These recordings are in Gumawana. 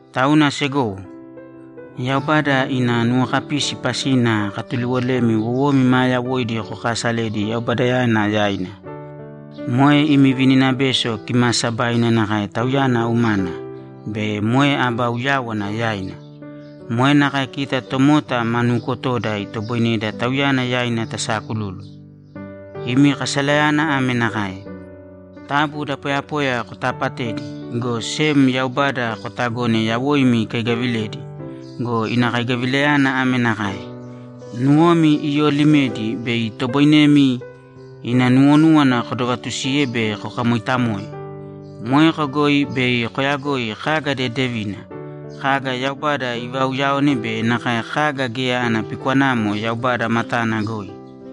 Tauna segowo, Yaubada ina nuwokapisi pasina akatuliwolemi wowomi maa yawoidi kokaasalēdi Yaubadayana yaina. Moe imi vininabeso kimaasabaina nakae Tauyana umana be moe aba uyáwana yaina. Moe nakae kita tomota ma nuukotoda itoboineda Tauyana yaina tasaakululu. Imi kasalayana ame nakae: Taabu da poyapoya kotaapatēdi, go sem Yaubada kotagōne yawoimi ikaigaviledi go, ina kaigavilayana ame nakae: Nuwomi iyoolimedi bei itoboinemi ina nuwonúwana kodovatusiye be kokamoitamoe. Moeko goi bei koyagoi kaga dedevina, kaga Yaubada ivauyaone be nakae kaga geya ana pikwanamo Yaubada matana goi.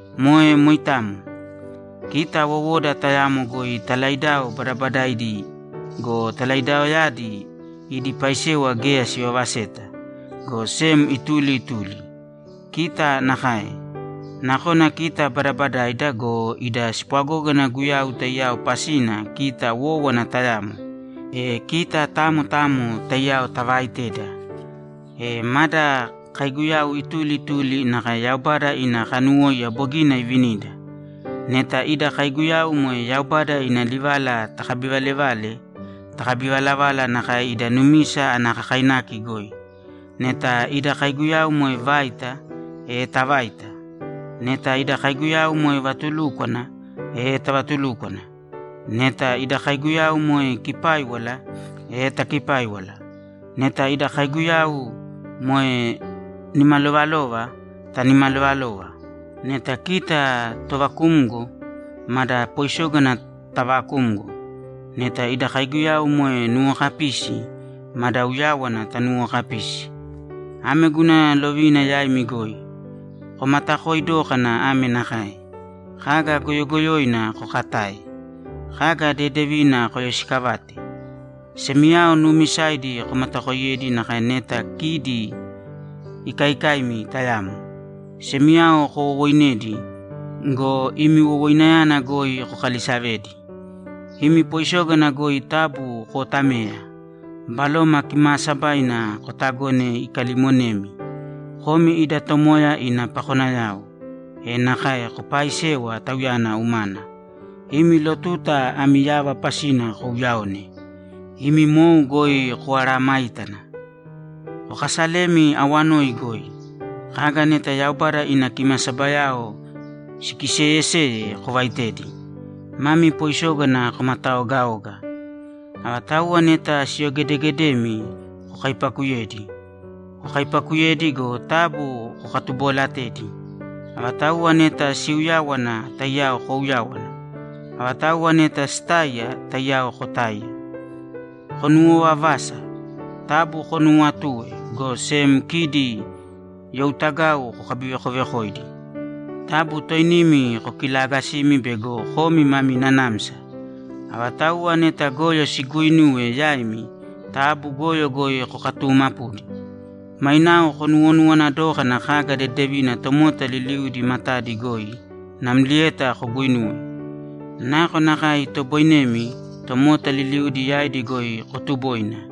Moe moitamo. Kita wowoda tayamo goi talaidao badabadaidi go, talaidaoyadi idi paisewa geya sivavaseta, go sem ituli ituli. Kita nakae. Nakona kita badabadaida go, ida spwagógana Guyau taiyao pasina kita wówana tayamo, e kita tamo tamo taiyao tavaaiteda. E mada kaiguyau ituli ituli nakae Yaubada ina kanuwóiya bogina ivinida. Neta ida kaiguyau moe Yaubada ina livala takabivalevale, takabivalavāla nakae ida numisa ana kakainaki goi. Neta ida kaiguyau moe vaita, e tavāita. Neta ida kaiguyau moe vatulúkwana, e tavatulūkwana. Neta ida kaiguyau moe kipáiwala, e takipāiwala. Neta ida kaiguyau moe nimalovalova, tanimalovalōva. Neta kita tovakumgo, mada poisógana taavakūmgo. Neta ida kaiguyau moe nuwokapisi, mada uyáwana tanuwokapīsi. Ame guna lovina yaimi goi. Komatakoi dōkana ame nakae: Kaga goyogoyoina kokatāe. Kaga dedevina koyoisiikavāte. Semiyao nuumisaidi komatakoiyēdi nakae neta kidi ikaikaimi tayamo. Semiyao kowowoinēdi go, imi wowoinayana goi kokalisavēdi. Imi poisógana goi taabu kootamēya. Baloma Kimaasabaina kotagōne ikalimonemi. Komi ida Tomoya ina pakonayao, e nakae kopaaisēwa Tauyana umana. Imi lotuta ami yava pasina kouyaōne. Imi mou goi koaaramāitana. Kokasalēmi awanoi goi. Kaga neta Yaubada ina kimasabayao sikiseeyeseye kovaitēdi. Mami poisógana komataogaōga. Avatauwa neta siyogedeegedemi kokaipakuyēdi. Kokaipakuyēdi go, taabu kokatuboolatēdi. Avatauwa neta siuyáwana, taiyao kouyāwana. Avatauwa neta sitáiya, taiyao kotāiya. Konuwovavāsa. Taabu konuuwatūe, go sem kidi youtagau kokabivekovekōidi. Taabu toinimi kokilaagasīmi bego komi mami nanamsa. Avatauwa neta goyo siguuinuwe yaimi, taabu goyo goi kokaatumāpu. Mainao konuwonuwana dōkana kaga dedevina tomota liliudi matadi goi namlieta koguinūwe. Nakonakae itoboinemi, tomota liliudi yaidi goi kotubōina.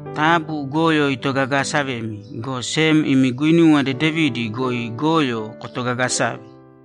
Taabu goyo itogagaasavēmi, go sem imi guinuwa dedevidi goi goyo kotogagasāve.